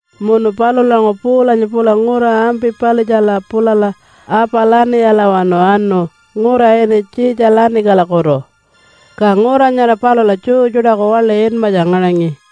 Munu palulanguṟu Paulanya pula ngura Ampi-palitjala pulala Apa-laniyalawanu anu ngura ini Tjitja-lanikalakutu. Ka ngura nyara palula Jew tjuṯaku waḻi inmatja ngaṟangi.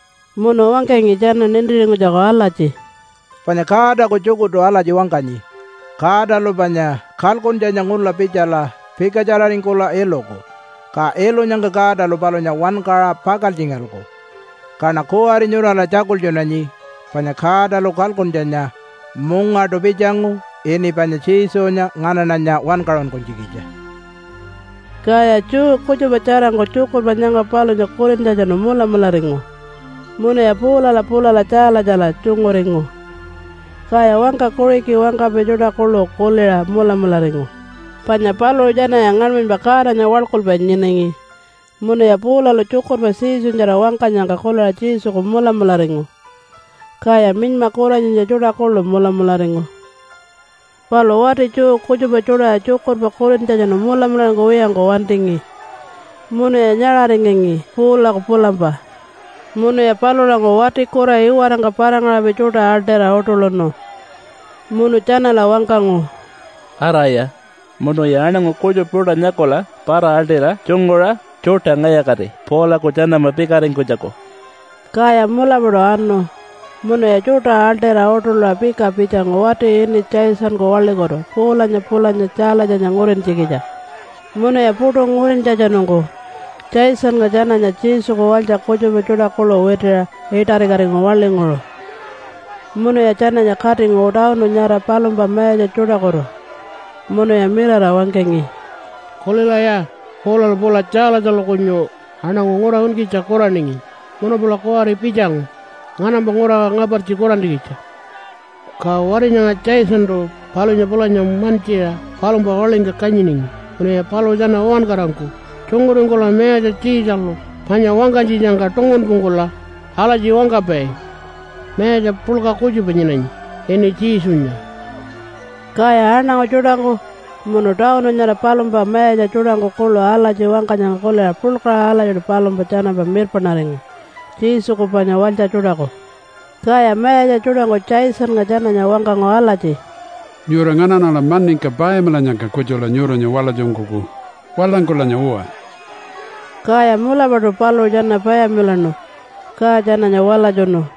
Munu wangkangi tjana nintiringkunytjaku alatji, “Panya Godaku tjukurtu alatji wangkanyi Godalu panya kalkuntjanya ngula pitjala pikatjararingkula iluku, ka ilunyangka Godalu palunya wankaṟa pakaltjingalku. Kaṉa kuwari nyurala tjakultjunanyi panya Godalu kalkuntjanya mungaṯu pitjangu ini panya Jesunya nganaṉanya wankaṟunkunytjikitja.” Kaya Jew kutjupa tjarangku tjukurpa nyanga palunya kulintjatjanu mulamularingu munuya Paulala pulala Tjaalatjala tjunguringu. Kaya wangka Kuṟiki wangkapai tjuṯa kuḻu kuliṟa mulamularingu, panya paluṟu tjanaya ngaṉmanypa Godanya waḻkulpai nyinangi munuya Paulalu tjukurpa Jesunyatjara wangkanyangka kuliṟa Jesuku mulamularingu. Kaya minyma kuranyitja tjuṯa kuḻu mulamularingu. Palu wati Jew kutjupa tjuṯaya tjukurpa kulintjatjanu mulamularingkuwiyangku wantingi munuya nyaṟaringangi Paulaku pulampa. Munuya palulanguṟu wati kura iwarangka para-ngaṟapai tjuṯa aḻṯira uṯuḻuṉu munu tjanala wangkangu, “Araya munuya aṉangu kutjupa tjuṯa nyakula para-aḻṯira tjunguṟa tjuṯa ngalya-kati Paulaku tjanampa pikaringkunytjaku.” Kaya mulapaṯu anu munuya tjuṯa aḻṯira uṯuḻuṟa pika pitjangu wati ini Jasonku waḻikutu Paulanya pulanya Tjaalatjanya ngurintjikitja. Munuya puṯu ngurintjatjanungku Jasonnga tjananya Jesuku walytja kutjupa tjuṯa kuḻu witiṟa iṯarikatingu waḻinguṟu munuya tjananya katingu tawunu nyara palumpa mayatja tjuṯakutu munuya mirara wangkangi, “Kulilaya! Paulalu pula Tjaalatjalu kunyu aṉangu ngura winkitja kuraningi munu pula kuwari pitjangu nganampa ngura ngapartji kurantjikitja. Ka wati nyanga Jasontu palunya pulanya mantjiṟa palumpa waḻingka kanyiningi. Munuya paluṟu tjana uwankarangku tjunguringkula mayatja Tjiitjalu panya wangkanytjitjangka tungunpungkula alatji wangkapai, ‘Mayatja puḻka kutjupa nyinanyi ini Jesunya.’” Kaya aṉangu tjuṯangku munu tawunu nyara palumpa mayatja tjuṯangku kuḻu alatji wangkanyangka kuliṟa puḻkaṟa alatjiṯu palumpa tjanampa mirpaṉaringu Jesuku panya walytja tjuṯaku. Kaya mayatja tjuṯangku Jasonnga tjananya wangkangu alatji, “Nyura nganaṉala maningka payamilannyangka kutjula nyuranya walatjunkuku. Walangkulanya uwa!” Kaya mulapaṯu paluṟu tjana payamilaṉu, ka tjananya walatjunu.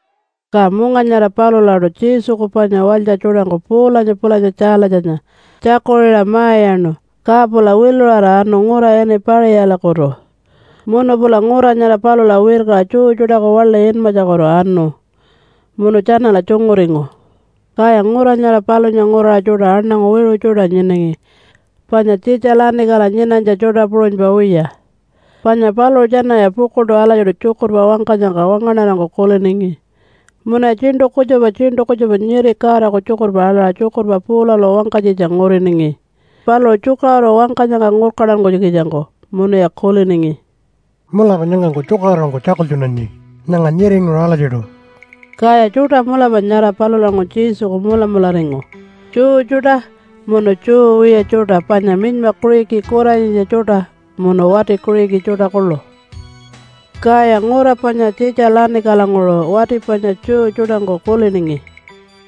Ka munga nyara palulaṯu Jesuku panya walytja tjuṯangku Paulanya pulanya Tjaalatjanya tjakuṟiṟa ma-iyaṉu ka pula wiluṟara anu ngura ini Paṟiyalakutu. Munu pula ngura nyara palula wirkaṟa Jew tjuṯaku waḻi inmatjakutu anu munu tjanala tjunguringu. Kaya ngura nyara palunya nguraṟa tjuṯa aṉangu wiṟu tjuṯa nyinangi panya Tjitja-lanikala nyinanytja tjuṯa puṟunypa wiya. Panya paluṟu tjanaya pukuḻṯu alatjiṯu tjukurpa wangkanyangka wangaṉarangku kuliningi. Munuya tjiṉṯu kutjupa tjiṉṯu kutjupa nyiri Godaku tjukurpa aḻaṟa tjukurpa Paulalu wangkanytjitja nguriningi paluṟu tjukaṟuru wangkanyangka ngurkantankunytjikitjangku munuya kuliningi, “Mulapa nyangangku tjukaṟurungku tjakultjunanyi nyanga nyiringuṟu alatjiṯu.” Kaya tjuṯa mulapa nyara palulanguṟu Jesuku mulamularingu, Jew tjuṯa munu Jew wiya tjuṯa panya minyma Kuṟiki kuranyitja tjuṯa munu wati Kuṟiki tjuṯa kuḻu. Kaya ngura panya Tjitja-lanikalanguṟu wati panya Jew tjuṯangku kuliningi,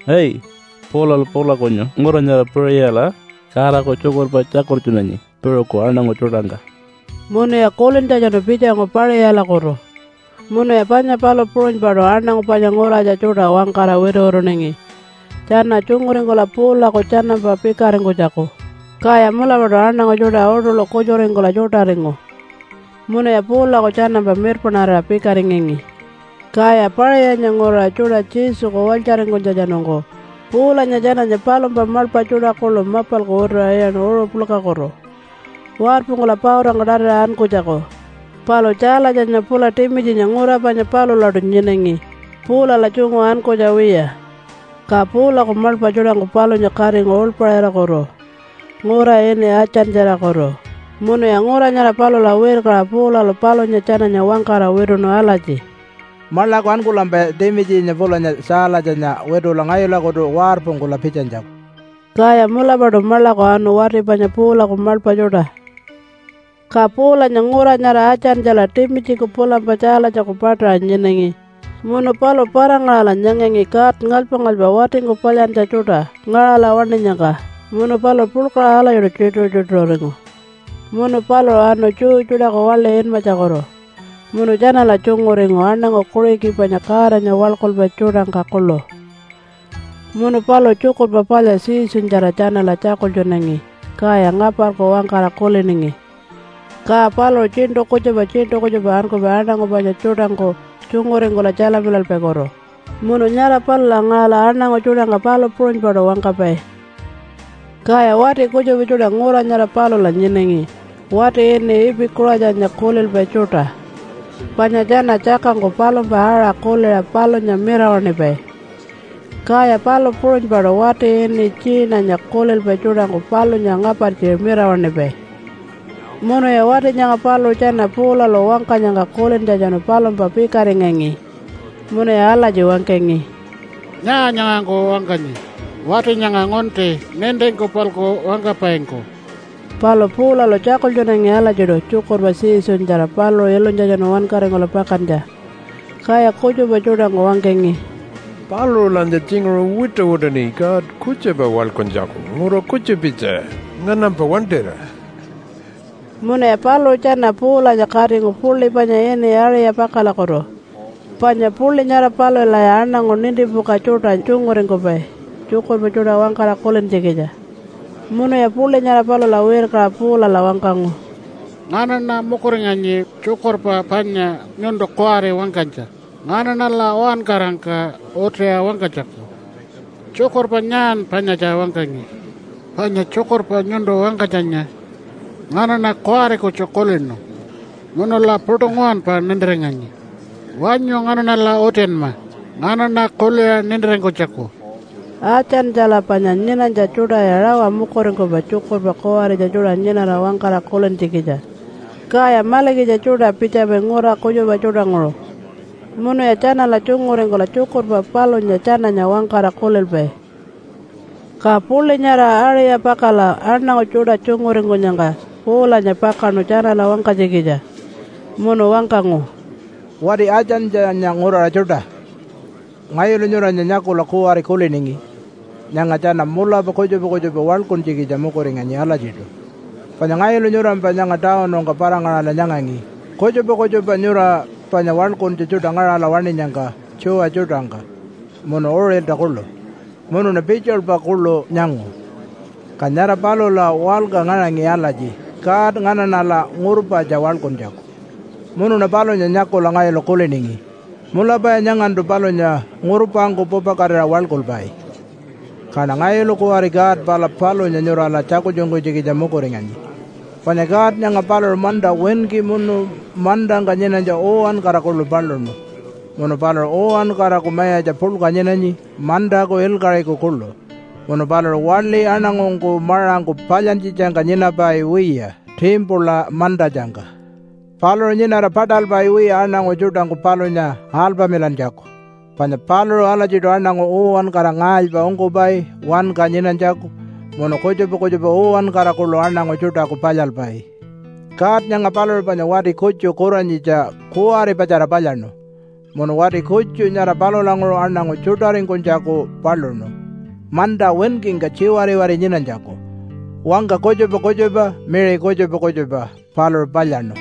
“Ai! Paulalu pula kunyu ngura nyara Paṟiyala Godaku tjukurpa tjakultjunanyi piṟuku aṉangu tjuṯangka.” Munuya kulintjatjanu pitjangu Paṟiyalakutu, munuya panya palu puṟunypaṯu aṉangu panya nguratja tjuṯa wangkara wituwituningi, tjana tjunguringkula Paulaku tjanampa pikaringkunytjaku. Kaya mulapaṯu aṉangu tjuṯa uṯuḻu kutjuringkula tjuṯaringu, munuya Paulaku tjanampa mirpaṉarira pikaringangi. Kaya Paṟiyanya nguraṟa tjuṯa Jesuku walytjaringkunytjatjanungku Paulanya tjananya palumpa maḻpa tjuṯa kuḻu mapalku wituṟa iyaṉu uṟu puḻkakutu, warpungkula pautangka tatiṟa ankunytjaku. Palu Tjaalatjanya pula Timitjinya ngura panya palulaṯu nyinangi, Paulala tjungu ankunytja wiya. Ka Paulaku maḻpa tjuṯangku palunya katingu uḻpaṟirakutu ngura ini Atjantjalakutu. Munuya ngura nyara palula wirkaṟa Paulalu palunya tjananya wangkara wituṉu alatji, “Maḻaku ankulampaya Timitjinya pulanya Tjaalatjanya witula ngayulakutu warpungkula pitjanytjaku.” Kaya mulapaṯu maḻaku anu wati panya Paulaku maḻpa tjuṯa. Ka Paulanya ngura nyara Atjantjala Timitjiku pulampa Tjaalatjaku paṯaṟa nyinangi munu paluṟu para-ngaṟala nyangangi god ngalypa-ngalypa watingku palyantja tjuṯa ngaṟala waṉinyangka munu paluṟu puḻkaṟa alatjiṯu tjituṟu-tjituṟuringu. Munu paluṟu anu Jew tjuṯaku waḻi inmatjakutu munu tjanala tjunguringu aṉangu Kuṟiki panya Godanya waḻkulpai tjuṯangka kuḻu munu paluṟu Tjukurpa Palya Jesunyatjara tjanala tjakultjunangi kaya ngaparku wangkara kuliningi. Ka paluṟu tjiṉṯu kutjupa tjiṉṯu kutjupa ankupai aṉangu panya tjuṯangku tjunguringkula tjalamilalpaikutu munu nyara palula ngaṟala aṉangu tjuṯangka palu puṟunypaṯu wangkapai. Kaya wati kutjupa tjuṯa ngura nyara palula nyinangi wati ini Ipi-kuṟatjanya kulilpai tjuṯa panya tjana tjakangku palumpa aṟa kuliṟa palunya mirawaṉipai. Kaya palu puṟunypaṯu wati ini Tjiinanya kulilpai tjuṯangku palunya ngapartji mirawaṉipai. Munuya wati nyanga paluṟu tjana Paulalu wangkanyangka kulintjatjanu palumpa pikaringangi munuya alatji wangkangi, “Nyaa nyangangku wangkanyi, wati nyanga ngunti nintingku-palku wangkapaingku?” Palu Paulalu tjakultjunangi alatjiṯu tjukurpa Jesunyatjara paluṟu ilunytjatjanu wankaringkula pakantja. Kaya kutjupa tjuṯangku wangkangi, “Paluṟulanya tjinguṟu wituwituṉi god kutjupa waḻkuntjaku ngura kutjupitja nganampa wantira.” Munuya paluṟu tjana Paulanya katingu puḻi panya ini Aṟi-yapakalakutu. Panya puḻi nyara palulaya aṉangu nintipuka tjuṯa tjunguringkupai tjukurpa tjuṯa wangkara kulintjikitja. Munuya puḻi nyara palula wirkaṟa Paulala wangkangu, “Nganaṉa mukuringanyi tjukurpa panya nyuntu kuwari wangkanytja nganaṉala uwankarangka utiṟa wangkanytjaku. Tjukurpa nyaan panyatja wangkangi? Panya tjukurpa nyuntu wangkanytjanya nganaṉa kuwari kutju kulinu munula puṯu nguwanpa nintiringanyi. Wanyu nganaṉala utinma nganaṉa kuliṟa nintiringkunytjaku.” (Atjantjala panya nyinanytja tjuṯaya rawa mukuringkupai tjukurpa kuwaritja tjuṯa nyinara wangkara kulintjikitja, kaya malikitja tjuṯa pitjapai ngura kutjupa tjuṯanguṟu munuya tjanala tjunguringkula tjukurpa palunya tjananya wangkara kulilpai.) Ka puḻi nyara Aṟi-yapakala aṉangu tjuṯa tjunguringkunyangka Paulanya pakaṉu tjanala wangkanytjikitja munu wangkangu, “Wati Atjantjanya nguraṟa tjuṯa! Ngayulu nyuranya nyakula kuwari kuliningi, ‘Nyanga tjana mulapa kutjupa kutjupa waḻkuntjikitja mukuringanyi alatjiṯu.’ Panya ngayulu nyurampa nyanga tawunungka para-ngaṟala nyangangi kutjupa kutjupa nyura panya waḻkuntja tjuṯa ngaṟala waṉinyangka tjuwa tjuṯangka munu uṟilta kuḻu. Munuṉa pitjilpa kuḻu nyangu, ka nyara palula walka ngaṟangi alatji, ‘God nganaṉala ngurpatja waḻkuntjaku.’ Munuṉa palunya nyakula ngayulu kuliningi, ‘Mulapaya nyangantu palunya ngurpangku pupakatira waḻkulpai.’ Kaṉa ngayulu kuwari God pala palunya nyurala tjakultjunkunytjikitja mukuringanyi. “Panya God nyanga paluṟu manta winki munu mantangka nyinanytja uwankara kuḻu paluṉu. Munu paluṟu uwankaraku Mayatja puḻka nyinanyi mantaku ilkaṟiku kuḻu. Munu paluṟu waḻi aṉangungku maṟangku palyantjitjangka nyinapai wiya timpula mantatjangka. Paluṟu nyinara paṯalpai wiya aṉangu tjuṯangku palunya alpamilantjaku, panya paluṟu alatjiṯu aṉangu uwankara ngaalypa ungkupai wanka nyinanytjaku munu kutjupa kutjupa uwankara kuḻu aṉangu tjuṯaku palyalpai. God nyanga paluṟu panya wati kutju kuranyitja kuwaripatjara palyaṉu, munu wati kutju nyara palulanguṟu aṉangu tjuṯaringkunytjaku paluṉu manta winkingka tjiwariwari nyinanytjaku. Wangka kutjupa kutjupa miṟi kutjupa kutjupa paluṟu palyaṉu.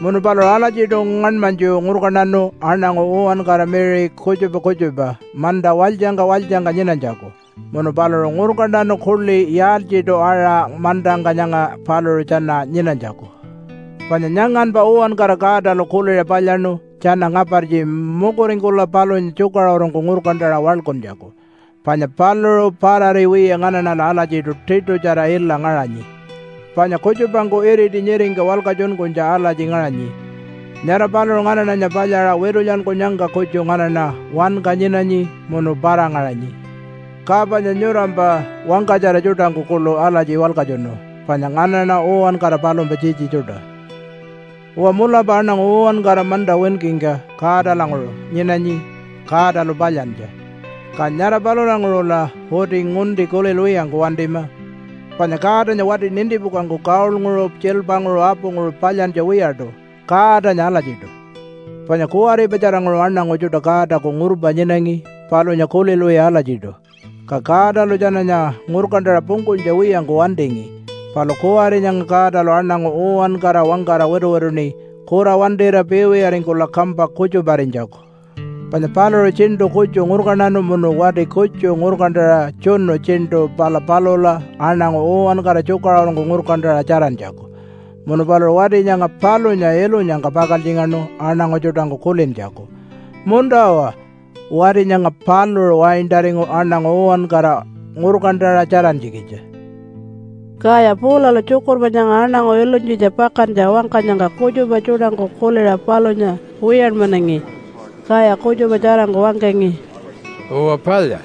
Munu paluṟu alatjiṯu ngaṉmanytju ngurkantanu aṉangu uwankara miṟi kutjupa kutjupa manta walytjangka walytjangka nyinanytjaku munu paluṟu ngurkantanu kuḻi yaaltjiṯu-aṟa mantangka nyanga paluṟu tjana nyinanytjaku. Panya nyanganpa uwankara Godalu kuliṟa palyaṉu tjana ngapartji mukuringkula palunya tjukaṟurungku ngurkantaṟa waḻkuntjaku. Panya paluṟu parari wiya nganaṉala alatjiṯu tiṯutjara ila ngaṟanyi. Panya kutjupangku iriti nyiringka walkatjunkunytja alatji ngaṟanyi, ‘Nyara paluṟu nganaṉanya palyaṟa witulyankunyangka kutju nganaṉa wanka nyinanyi munu para-ngaṟanyi.’ Ka panya nyurampa wangkatjara tjuṯangku kuḻu alatji walkatjunu, ‘Panya nganaṉa uwankara palumpa tjitji tjuṯa.’ “Uwa, mulapa aṉangu uwankara manta winkingka Godalanguṟu nyinanyi Godalu palyantja. Ka nyara palulanguṟula uti ngunti kulilwiyangku wantima, panya Godanya wati nintipukangku gold-nguṟu tjiilpanguṟu apunguṟu palyantja wiyaṯu, Godanya alatjiṯu. Panya kuwaripatjaranguṟu aṉangu tjuṯa Godaku ngurpa nyinangi palunya kulilwiya alatjiṯu, ka Godalu tjananya ngurkantaṟa pungkunytja wiyangku wantingi. Palu kuwari nyanga Godalu aṉangu uwankara wangkara wituwituṉi kura wantira piiwiyaringkula kampa kutjuparinytjaku. Panya paluṟu tjiṉṯu kutju ngurkantanu munu wati kutju ngurkantaṟa tjunu tjiṉṯu pala palula aṉangu uwankara tjukaṟurungku ngurkantaṟa tjarantjaku. Munu paluṟu wati nyanga palunya ilunyangka pakaltjingaṉu aṉangu tjuṯangku kulintjaku, ‘Munta-uwa! Wati nyanga paluṟu waintaringu aṉangu uwankara ngurkantaṟa tjarantjikitja.’” Kaya Paulalu tjukurpa nyanga aṉangu ilunytjitja pakantja wangkanyangka kutjupa tjuṯangku kuliṟa palunya wiyanmanangi. Kaya kutjupa tjarangku wangkangi, “Uwa palya!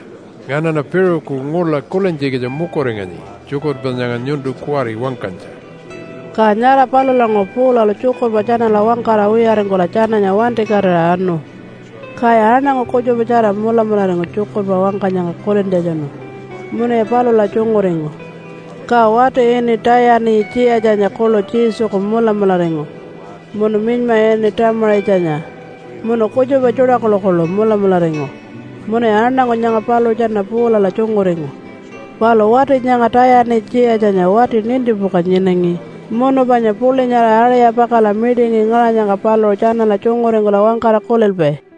Nganaṉa piṟuku ngula kulintjikitja mukuringanyi tjukurpa nyanga nyuntu kuwari wangkanytja.” Ka nyara palulanguṟu Paulalu tjukurpa tjanala wangkara wiyaringkula tjananya wantikatira anu. Kaya aṉangu kutjupatjara mulamularingu tjukurpa wangkanyangka kulintjatjanu munuya palula tjunguringu. Ka wati ini Tayani-tjiyatjanya kuḻu Jesuku mulamularingu munu minyma ini Tamaṟitjanya munu kutjupa tjuṯa kuḻukuḻu mulamularingu munuya aṉangu nyanga paluṟu tjana Paulala tjunguringu. Palu wati nyanga Tayani-tjiyatjanya wati nintipuka nyinangi munu panya puḻi nyara Aṟi-yapakala mitingi ngaṟanyangka paluṟu tjanala tjunguringkula wangkara kulilpai.